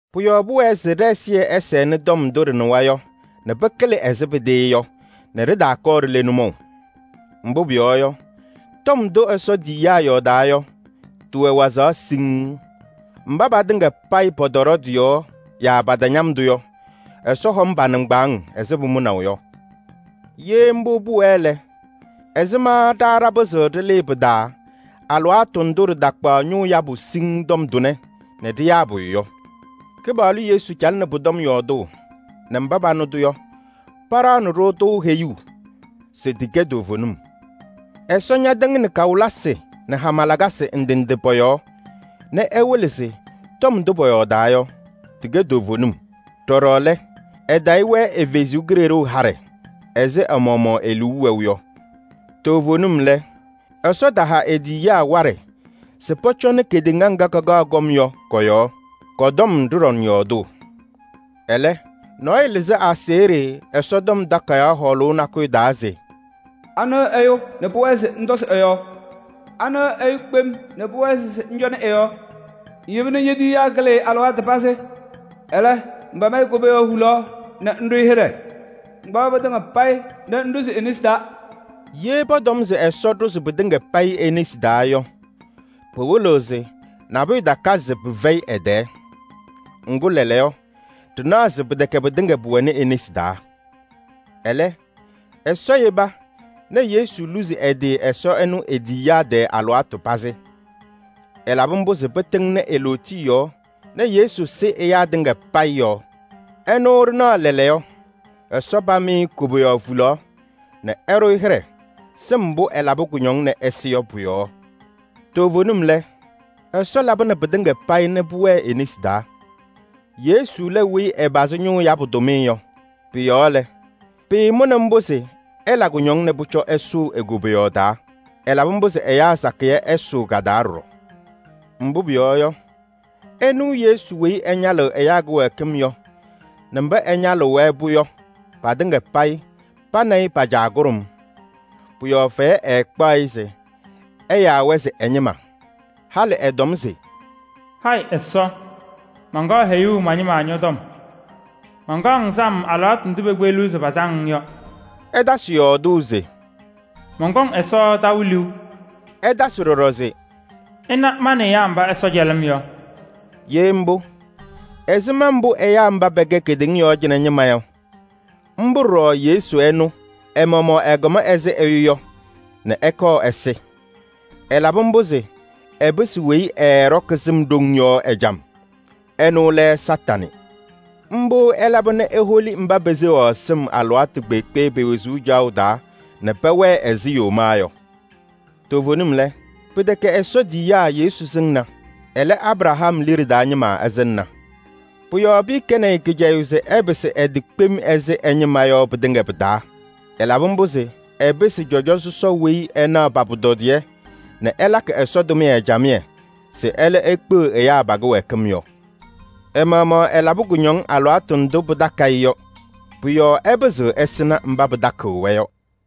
Pʋ-yɔɔ pʋwɛɛ se ɖɛ-ɛzɩyɛ ɛsɛnɩ tɔm ndʋ ɖɩnɩwa yɔ nɛ pɩkɩlɩ ɛzɩ pɩtɩɩ yɔ nɛ ɖɩtaakɔɔ ɖile nʋmɔʋ. Mbʋ pʋyɔɔ yɔ, tɔm ndʋ Ɛsɔ tiyiyaa yɔɔdaa yɔ tɩwɛ wazaɣ siŋŋ. Mba patɩŋa payɩ pɔtɔɖɔ tɩ-yɔɔ yaa patañam-tʋ yɔ, Ɛsɔ hɔm pa-nɩŋgbaaŋ ɛzɩ pʋmʋnaʋ yɔ. Ye mbʋ pʋwɛɛ lɛ, ɛzɩma ɖa ɖapɩzɩɣ ɖɩlɩɩ pɩ-taa alɩwaatʋ ndʋ ɖɩtakpaɣ ñʋʋ yabʋ siŋŋ tɔm tʋnɛ nɛ ɖɩyaa pʋyʋ yɔ? Kɩpaɣlʋ Yesu calɩnɩ pʋ-tɔm yɔɔdʋʋ nɛ mba panɩ-tʋ yɔ, paɖaɣnɩ-ɖʋ-tʋ heyuu se tɩkɛ toovenim. Ɛsɔ ñatɩŋnɩ kawɩlɩsɩ nɛ hama lakasɩ ndɩ ndɩ pɔ-yɔɔ nɛ ɛwɩlɩ se tɔm ndʋ pɔyɔɔdaa yɔ, tɩkɛ toovenim. Ɖɔɖɔ lɛ, ɛtayɩ-wɛ ɛ-Kalɩzaɣ haɖɛ ɛzɩ ɛ-maɣmaɣ e-liu wɛʋ yɔ. Toovenim lɛ, Ɛsɔ taha e-tiyiyaa waɖɛ se pɔcɔnɩ kedeŋa ŋga kakaɣ kɔm yɔ kɔ-yɔɔ. Kɔ-tɔm ɖɩɖɔŋ yɔɔdʋʋ. Ɛlɛ, nɔɔyʋ lɩzɩ aseɣɖe Ɛsɔtɔm Takayaɣ hɔɔlʋʋ nakʋyʋ taa se: “Anɩ ɛyʋ nɛ pʋwɛɛ se ŋtɔzɩ ɛ-yɔɔ? Anɩ ɛyʋ kpem nɛ pʋwɛɛ se ŋcɔnɩ ɛ-yɔɔ? Ŋyeba nɛ ñe-tiyiyaa kɩlɩ-ɩ alɩwaatʋ pazɩ. Ɛlɛ, ŋpam-ɩ koboyaɣ hulaɣ nɛ ŋɖʋ-ɩ hɩɖɛ. Ŋkpaɣ pɩtɩŋa payɩ nɛ ŋɖʋzɩ e-nesi taa.” Ye pɔtɔm se Ɛsɔ ɖʋzɩ pɩtɩŋa payɩ e-nesi taa yɔ, pɩwɩlɩɣ se nabʋyʋ takazɩ se pɩfɛyɩ ɛ-tɛɛ. Ŋgʋ lɛɛlɛɛyɔ, ɖɩnaɣ se pɩtɛkɛ pɩtɩŋa pʋwɛnɩ e-nesi taa. Ɛlɛ, Ɛsɔ yeba nɛ Yesu luzi ɛ-tɩ Ɛsɔ ɛnʋ e-tiyiyaa tɛɛ alɩwaatʋ pazɩ. Ɛlabɩ mbʋ se pɩtɩŋnɩ e-lootiye yɔɔ nɛ Yesu sɩ ɛyaa tɩŋa payɩ yɔɔ. Ɛnʋ ɖɩnaɣ lɛɛlɛɛyɔ, Ɛsɔ pam-ɩ koboyaɣ hulaɣ nɛ ɛɖʋ-ɩ hɩɖɛ sɩm mbʋ ɛlabɩ kʋñɔŋ nɛ ɛsɩ yɔ pʋ-yɔɔ. Toovenim lɛ, Ɛsɔ labɩnɩ pɩtɩŋa payɩ nɛ pʋwɛɛ e-nesi taa. Yesu lɛ weyi ɛpazɩ ñʋʋ yabʋ tʋmɩyɛ yɔ. Pʋ-yɔɔ lɛ, pɩɩmʋnɩ mbʋ se ɛla kʋñɔŋ nɛ pʋcɔ ɛsʋʋ e-koboyaɣ taa. Ɛlabɩ mbʋ se ɛyaa sakɩyɛ ɛsʋʋ ka-taa ɖɔɖɔ. Mbʋ pʋyɔɔ yɔ, ɛnʋ Yesu weyi ɛñalɩɣ ɛyaa kɩwɛɛkɩm yɔ nɛ mba ɛñalɩɣ-wɛ-pʋ yɔ, patɩŋa payɩ pa nɛ ɩ pa-Caa kʋɖʋm. Pʋ-yɔɔ fɛyɛ ɛɛkpaɣ-ɩ se ɛyaa-wɛ se ɛ-ñɩma. Halɩ ɛtɔm se: “Hayɩ Ɛsɔ! Mankaɣ heyuu ma-ñɩma ñɔ-tɔm. Mankaɣ-ŋ sam alɩwaatʋ ndʋ pekpeɣliɣ se pasam-ŋ yɔ.” Ɛtasɩ yɔɔdʋʋ se: “Mɔnkɔŋ Ɛsɔ taʋ liu.” Ɛtasɩ ɖɔɖɔ se: “Ɩna ma nɛ ɛyaa mba Ɛsɔ cɛlɩ-m yɔ!” Ye mbʋ, ɛzɩma mbʋ ɛyaa mba pɛkɛ kedeŋa yɔɔ cɩnɛ ñɩma yɔ, mbʋ ɖɔɖɔ Yesu ɛnʋ ɛ-maɣmaɣ ɛkɔm ɛzɩ ɛyʋ yɔ nɛ ɛkɔɔ ɛsɩ. Ɛlabɩ mbʋ se ɛpɩsɩ weyi ɛɛɖɔkɩ sɩm ɖoŋ yɔ ɛjam: ɛnʋ lɛ Kañadʋ Satanɩ. Mbʋ ɛlaba nɛ eholi mba peseɣaɣ sɩm alɩwaatʋ kpeekpe pe-wezuu caɣʋ taa nɛ pɛwɛɛ ɛzɩ yomaa yɔ. Toovenim lɛ, pɩtɛkɛ Ɛsɔ tiyiyaa Yesu sɩŋna. Ɛlɛ, Abraham liɖe taa ñɩma ɛsɩŋna. Pʋ-yɔɔ pɩɩkɛnɩ-ɩ kɩcɛyʋʋ se ɛpɩsɩ ɛ-tɩ kpem ɛzɩ ɛ-ñɩma yɔ pɩtɩŋa pɩ-taa. Ɛlabɩ mbʋ se ɛpɩsɩ cɔjɔ sɔsɔ weyi ɛnaɣ pa-pʋtɔdɩyɛ nɛ ɛlakɩ Ɛsɔ tʋmɩyɛ camɩyɛ se ɛlɛ ekpeɣ ɛyaa pa-kɩwɛɛkɩm yɔ. Ɛ-maɣmaɣ ɛlabɩ kʋñɔŋ alɩwaatʋ ndʋ pɩtakɩ-ɩ yɔ. Pʋ-yɔɔ ɛpɩzɩɣ ɛsɩnɩ mba pɩtakɩɣ-wɛ yɔ.